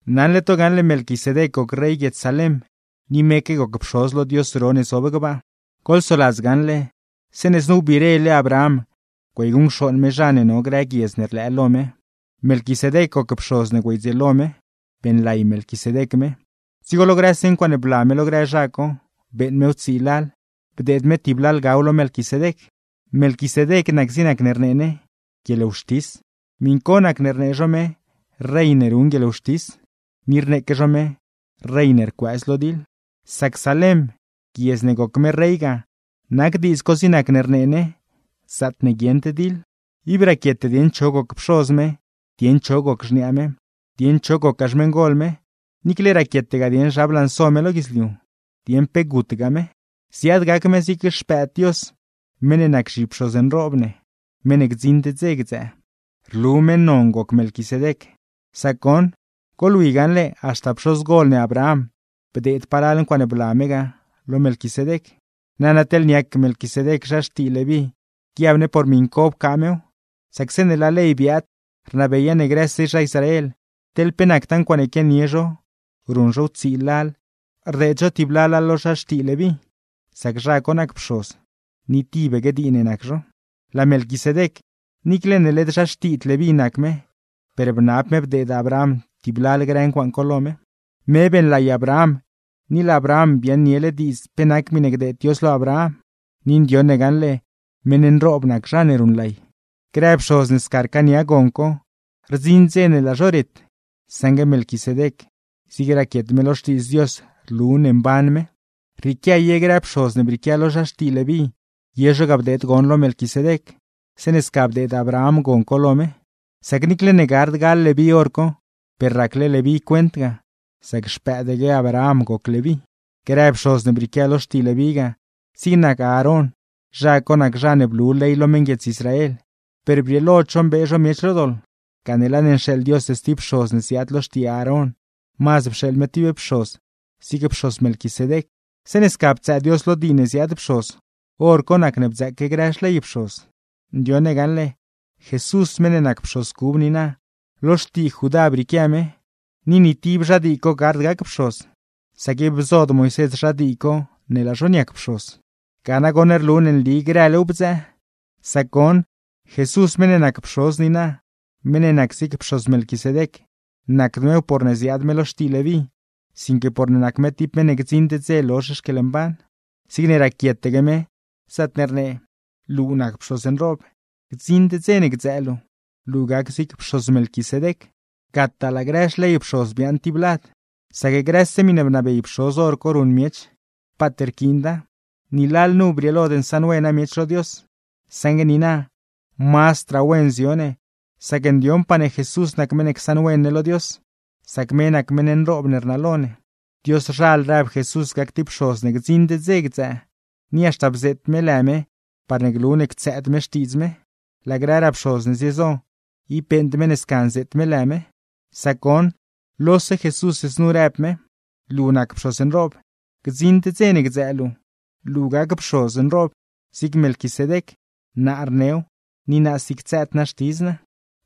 Naṉle to gaṉle Melquisedec goc rey guiedz Salem, ni meque goc pxoz lo Dios ro ne zob gbaa. Goḻsoladz gaṉle, zeeṉe znu wbirele Abraham güeyguṉcxooṉ me zha ne no grë guiedz ne rlëë lo me, Melquisedec goc pxoz ne güeydzieelo me, beeṉlay Melquisedec me. Dzigo lo grëse ncuaaṉe bla me lo grë zha co, beeṉ mew tsii lal, bdeed me tib lalgaw lo Melquisedec. Melquisedec nac zig nacne rnee ne “guieḻwxtis”, miṉ co nac ne rnee zho me “rey ne ruṉ guieḻwxtis”; ni rneeque zho me “rey ne rcuëëz lo diḻ”, sac Salem (guiedz ne goc me rey ga) nac diidz co zig nac ne rnee ne “zaatne guieṉd diḻ”. Ib raquiete dieṉ cho goc pxoz me, dieṉ cho goc xniaa me, dieṉ cho gocgaa xmeṉgol me; niicle raquietegaa dieṉ zha blanso me lo guidzliu, dieṉ pe gutgaa me. Ziaad gac me zig Xpëëd Dios, meṉ ne nac zhipxoz nroob ne, meṉ ne gdziṉd dze gdzëë. Rlu meṉ non goc Melquisedec; sac goṉ: a) Goḻwi gaṉle, haxta pxozgol ne Abraham bdeed palal ncuaaṉe bla me ga, lo Melquisedec. Nana, teḻne niac Melquisedec zha xtii Leví guiab ne por miṉ co pcaa mew, sac zeeṉe laa ley biaad rnabeya ne grëse zha Israel, teḻ pe nactaa ncuaaṉe quianie zho ruṉ zhow tsii lal rdeed zho tib lala lo zha xtii Leví, sac zha co nac pxoz; ni tibaque dii ne nac zho. Laa Melquisedec, niicle ne led zha xtiid Leví nac me, per bnab me bdeed Abraham tib lal grë ncuaaṉ co lo me. b) Me beeṉlay Abraham; ni laa Abraham biaaṉniele diidz pe nac miṉe gdeed Dios lo Abraham. Ni ndioṉ ne gaṉle meṉ nroob nac zha ne ruṉlay. c) Grë pxoz ne sca rcaania gon co, rdziṉ dze ne laa zho ret; saṉgue Melquisedec, zigne raquiet me lo Xtiidz Dios rlu ne mban me. d) Rrieequia ye grë pxoz ne brieequia lo zha xtii Leví ye zho ga bdeed gon lo Melquisedec, zeeṉe sca bdeed Abraham gon co lo me. Sac niicle ne gard gal Leví hor co, per racle Leví cuent ga, sac xpëëdaque Abraham goc Leví. e) Grë pxoz ne brieequia lo xtii Leví ga, zig nac Aarón; zha co nac zha ne blu ley lo meṉguiedz Israel; per brieelod zho mbee zho miech lo doḻ, gane laa ne nxeeḻ Dios stib pxoz ne ziaad lo xtii Aarón, mazd pxeeḻ me tib pxoz zig pxoz Melquisedec. Zeeṉe sca ptsëë Dios lo dii ne ziaad pxoz, hor co nacne bdzëëque grë xley pxoz. Ndioṉ ne gaṉle, Jesús meṉ ne nac pxoz cub niina, lo xtii Judá brieequia me, ni ni tib zha dii co gard gac pxoz, sac ib bzod Moisés zha dii co ne laa zho niac pxoz. Ga nagoṉ rlu ne nli grëw bdzëë. Sac goṉ, Jesús meṉ ne nac pxoz niina, meṉ ne nac zig pxoz Melquisedec, nacd mew porne ziaad me lo xtii Leví, sinque porne nac me tib meṉ ne gdziṉd dze lozh xquieḻmban. Zigne raquietaque me, zaatne rnee: Luu nac pxoz nroob, gdziṉd dze ne gdzëë luu, luu gac zig pxoz Melquisedec. Gataa laa grë xley pxoz biaaṉ tib lad, sac grëse miṉe bnabey pxoz hor co ruṉ miech, paat pquiinda. Ni lalnu brieelod nsaṉwena miech lo Dios; saṉgue niina, mazdraa wen zio ne, sac ndioṉpaa ne Jesús nac meṉ ne csaṉwen ne lo Dios, sac me nac meṉ nroob ne rnalo ne. Dioszhal rëb Jesús gac tib pxoz ne gdziṉd dze gdzëë, ni haxta bzeet me lë me parne glu ne ctsëëd me xtiidz me; laa grëraa pxoz ne ziezo, ib beeṉd me ne sca nzeet me lë me. Sac goṉ, lose Jesús znu rëb me: Luu nac pxoz nroob, gdziṉd dze ne gdzëë luu, luu gac pxoz nroob zig Melquisedec. Naa rnew, ni naasi ctsëëd naa xtidz naa.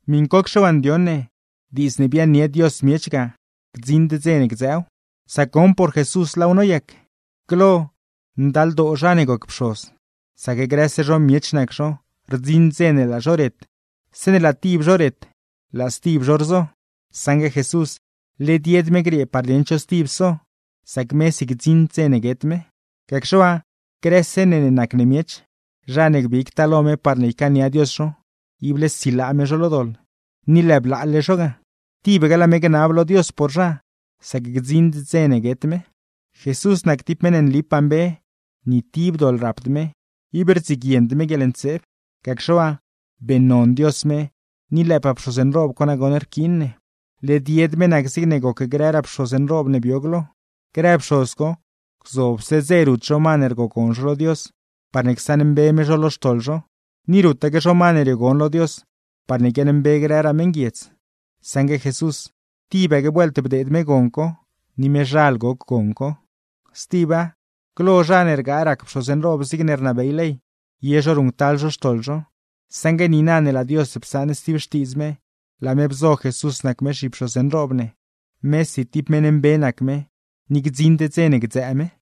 Miṉcocxe waa ndioṉ ne, diidz ne biaaṉnie Dios miech ga gdziṉd dze ne gdzëëw; sac goṉ, por Jesús laaw noyac. Glo, ndaldoo zha ne goc pxoz, sac grëse zho miech nac zho, rdziṉ dze ne laa zho ret, zeeṉe laa tib zho ret laa stib zho rzo. Saṉgue Jesús, led yed me griee par dieṉ cho stib so, sac mesi gdziṉd dze ne guet me. Gacxe waa, grëse ne ne nac ne miech, zha ne gbigtaa lo me parne ycaania Dios zho, ible silaa me zho lo doḻ, ni lëë blaale zho ga. Tibaque laa me gnab lo Dios por zha, sac gdziṉd dze ne guet me. Jesús nac tib meṉ ne nlipaa mbe, ni tib doḻ rapd me, ib rdziguiend me guieḻntseeb; gacxe waa, beeṉnon Dios me, ni lëëpaa pxoz nroob co nagoṉ rquiin ne. Led yed me nac zigne goc grëraa pxoz nroob ne bio glo. Grë pxoz co, gzobse dze rut zho ma ne rgogon zho lo Dios, parne csaṉmbe me zho lo xtoḻ zho; ni rutaque zho ma ne riogon lo Dios parne guiaaṉmbe grëraa meṉguiedz; saṉgue Jesús, tibaque vuelt bdeed me gon co, ni mezhal goc gon co. Stiba, glo, zha ne rgaa rac pxoz nroob zigne rnabey ley, ye zho ruṉctal zho xtoḻ zho; saṉgue niina ne laa Dios psaṉ stib xtiidz me, laa me bzo Jesús nac me zhipxoz nroob ne, mesi tib meṉ mbe nac me, ni gdziṉd dze ne gdzëë me.